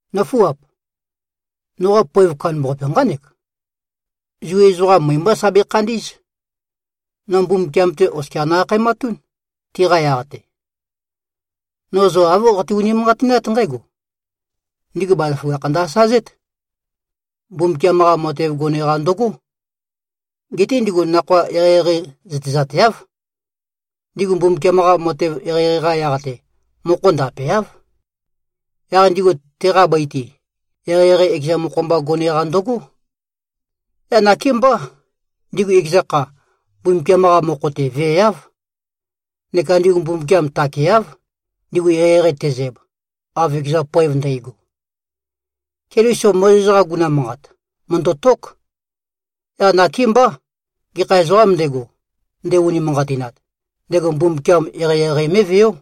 Nǿfuap! Noqa poev kandambaqape nqánek: Zu ezoqam møe-mbá sa bekhandí꞉z. No Mbumbukiam-te oskia no-akhaematún, tiqa yaq-te. No zo āv qate-unimanqatinát nqǽgo: Ndigu bazaføgakh ndø-asazét. Mbumbukiam-qa matev gone-qa ndøgó. Geté ndigu nakhoa eqeieqei zøtezateáv. Ndigu Mbumbukiam-qa matev eqeieqei-qa yaq-te, mokho ndapeáv. Yaq ndigu teqa bøi-te, eqeieqei ekeza mokho-mba gone-qa ndøgó. Yaq nakémbá, ndigu ekeza kha, Mbumbukiam-qa mokho-te veeáv. Neka ndigu Mbumbukiam takeáv, ndigu eqeieqei tezæb, av ekeza poev ndægo. Keliso Mozes-qa guguna manqat, mø̀ndøtók. Yaq nakémbá, gekha ezoqām ndego, nde-unimanqatinat, ndego Mbumbukiam eqeieqei mé꞉veó.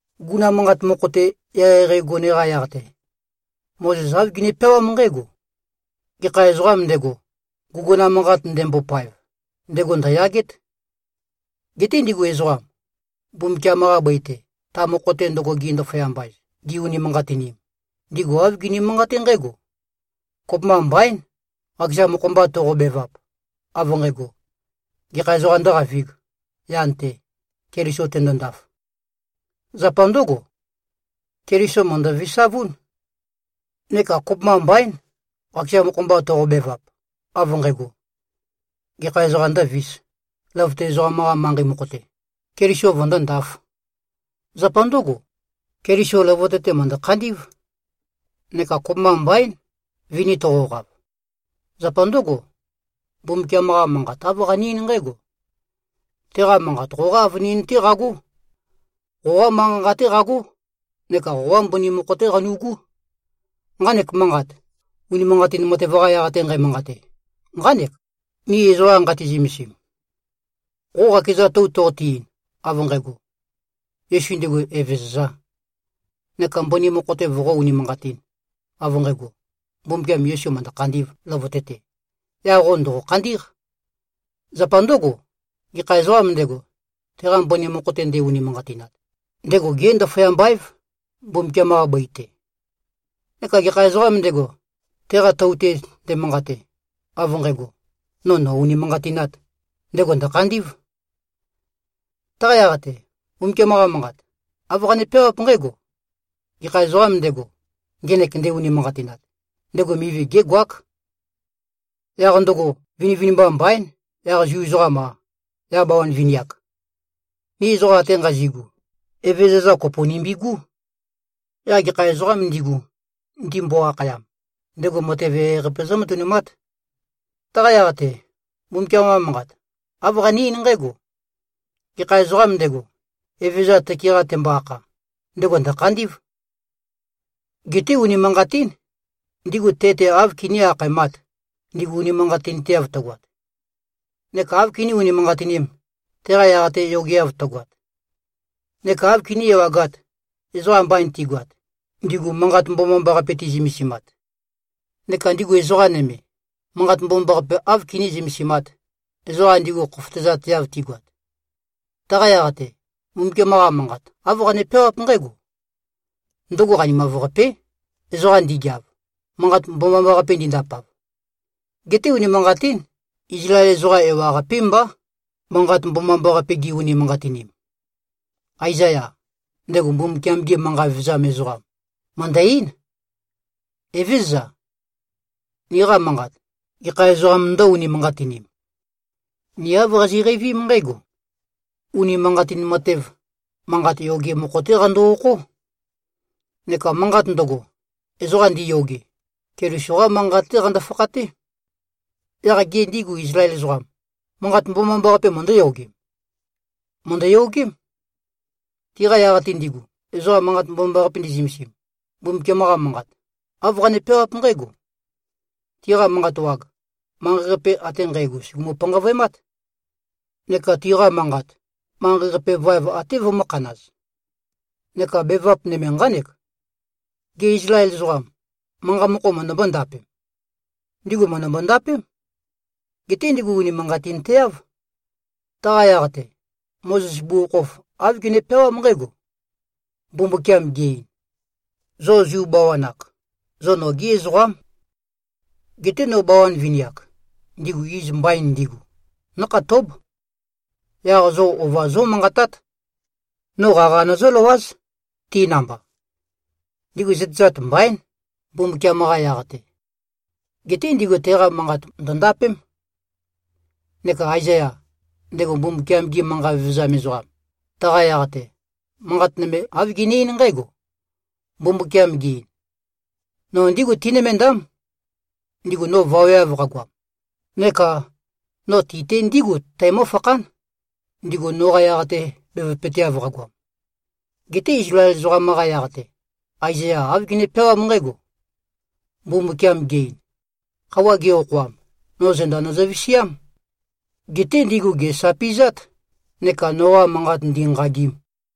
Guguna manqat mokho-te eqeieqei gone-qa yaq-te, Mozes āv gene-peawám nqǽgo, “Gekha ezoqām ndego, guguna manqat ndembopaev, ndego ndø̀yagét.” Geté ndigu ezoqam, Mbumbukiam-qa bøi-te, ta mokho-te ndøgo gi-ndaføyamba-ez, gi-unimanqatinim, ndigu āv gini-manqaté nqǽgo: Kopømba mbaín, qakeza mokho-mba toqobevap, av nqægo, “Gekha ezoqām ndǿqavīg, yan-te, Keliso tendondaf?” Zapa ndǿgo, Keliso mø̀ndø-visavún. Neka kopømba mbaín, qakeza mokho-mba toqobevap, av nqægo, “Gekha ezoqām ndǿvīs, løvøte ezoqam-qa manqei mokho-te, Keliso vøndóndāf?” Zapa ndǿgo, Keliso løvøte-te mø̀ndø-khandí꞉v. Neka kopømba mbaín, vini toqoqav. Zapa ndǿgo, Mbumbukiam-qa Manqat āv qane-eín nqǽgo, “Teqa Manqat qoqá avønin-té qagó. Qoqa manqa-nqa-té qagó neka qoqa mbøni mokho-té qanu꞉gú.” Nqanek manqat, unimanqatin matev-qa yaq-te nqæmanqate, nqánek, ni ezoqa nqati-zømesim. Qo qakeza tou toqote-ein, av nqægo, “Yesu ndego Evezøzā,” neka mbøni mokho-te voqó-unimanqatīn, av nqægo, Mbumbukiam Yesu mø̀ndø-khandī꞉v løvøte-te, yaq qo ndòqo-khandí꞉q. Zapa ndǿgo, gekha ezoqām ndego, teqa mbøni mokho-te nde-unimanqatinat, ndego gé-ndaføyamba-év, Mbumbukiam-qa bøi-te. Neka gekha ezoqām ndego, teqa tou-te ndemanqate, av nqægo, “No nò-unimanqatināt,” ndego ndø̀khandí꞉v. Taqa yaq-te, Mbumbukiam-qa Manqat, āv qane-peawáp nqǽgo, “Gekha ezoqām ndego, ngenek nde-unimanqatinat, ndego mivi gégoák.” Yaq ndøgo, vinivinimba mbaín, yaq Zu ezoqam-a, yaq bawan vini-ak. Ni ezoqam ate nqazi꞉gu, Evezøza kopo nimbigú. Yaq gekha ezoqām ndigu, ndimbo-akhayam, ndego matev eqeieqei-qape zǿmatønumát. Taqa yaq-te, Mbumbukiam-qa Manqat āv qane-eín nqǽgo, “Gekha ezoqām ndego, Evezøza tøke-qa tembo-akha, ndego ndø̀khandí꞉v.” Geté unimanqatín, ndigu te-te áv kiní-akhaemāt, ndigu unimanqatinteav tøgoat? Neka áv kiní-unimanqatinīm, teqa yaq-te yogeav tøgoat? Neka áv kiní-ewagāt, ezoqam mbain tigoat, ndigu Manqat Mbomambaqape ti꞉zømesimat? Neka ndigu ezoqa nøme, Manqat Mbomambaqape áv kiní-zømesimāt, ezoqa ndigu khofotøzateav tigoat? Taqa yaq-te, Mbumbukiam-qa Manqat, āv qane-peawáp nqǽgo, “Ndøgo qanimav-qapé, ezoqam ndigeav, Manqat Mbomambaqape ndindapav.” Geté unimanqatín. Izlael ezoqa ewaqapé mbá, Manqat Mbomambaqape gi-unimanqatinim. Aezaya, ndego Mbumbukiam-ge manqa vevezam ezoqam, mø̀ndø-eín, “Evézøza! Niqa manqat, gekha ezoqām ndǿ-unimanqatinim?” Ni āv qazi꞉qeivím nqǽgo: Unimanqatin matev, manqat yoge mokho-té qando-okhó. Neka manqat ndøgo, ezoqa ndiyoge, Keliso-qá manqat-té qando-fakhaté. Yaq gê, ndigu Izlael ezoqam, Manqat Mbomambaqape møndǿyogem? Mø̀ndøyogém. Tiqa yaq-te ndigu, ezoqa Manqat Mbomambaqape ndi꞉zømesim, Mbumbukiam-qa Manqat, āv qane-peawáp nqǽgo, “Tiqa manqa wag, manqei-qape ate nqægo sùgumu-panqavøemát. Neka tiqa manqat, manqei-qape vaev até vømø̄khanaz.” Neka bevap nøme nqánek: Gê, Izlael ezoqam, manqa mokho møndømbó-ndapem? Ndigu mø̀ndømbo-ndapém. Geté ndigu unimanqatinteáv. Taqa yaq-te, Mozes bugukhokhof āv gene-peawám nqǽgo, “Mbumbukiam ge-ein: Zo Zu bawan-ak, zo nogí ezoqám. Geté no bawan vini-ak, ndigu iz mbain ndigu, nǿkhatób. Yaq zo ova zómanqatát. No qaqa nøzǿløwáz, ti namba. Ndigu zøtezat mbaín, Mbumbukiam-qa yaq-te. ⌞Geté ndigu teqa manqat ndø̀ndapém.⌟” Neka Aezaya, ndego Mbumbukiam-ge manqa vevezam ezoqam, taqa yaq-te, manqat nøme āv gene-eín nqǽgo, “Mbumbukiam ge-ein: No ndígu tinømendám, ndigu no vaweav qagoam. Neka: No ti-te ndígu tæmøfakhán, ndigu noqa yaq-te bevøpøteav qagoam.” Geté Izlael ezoqam-qa yaq-te, Aezaya āv gene-peawám nqǽgo, “Mbumbukiam ge-ein: Khøuwa ge-okhoam, no zenda nøzø-visiám. Geté ndigu gèsapi꞉zát neka noqa manqat ndīnqāgīm.”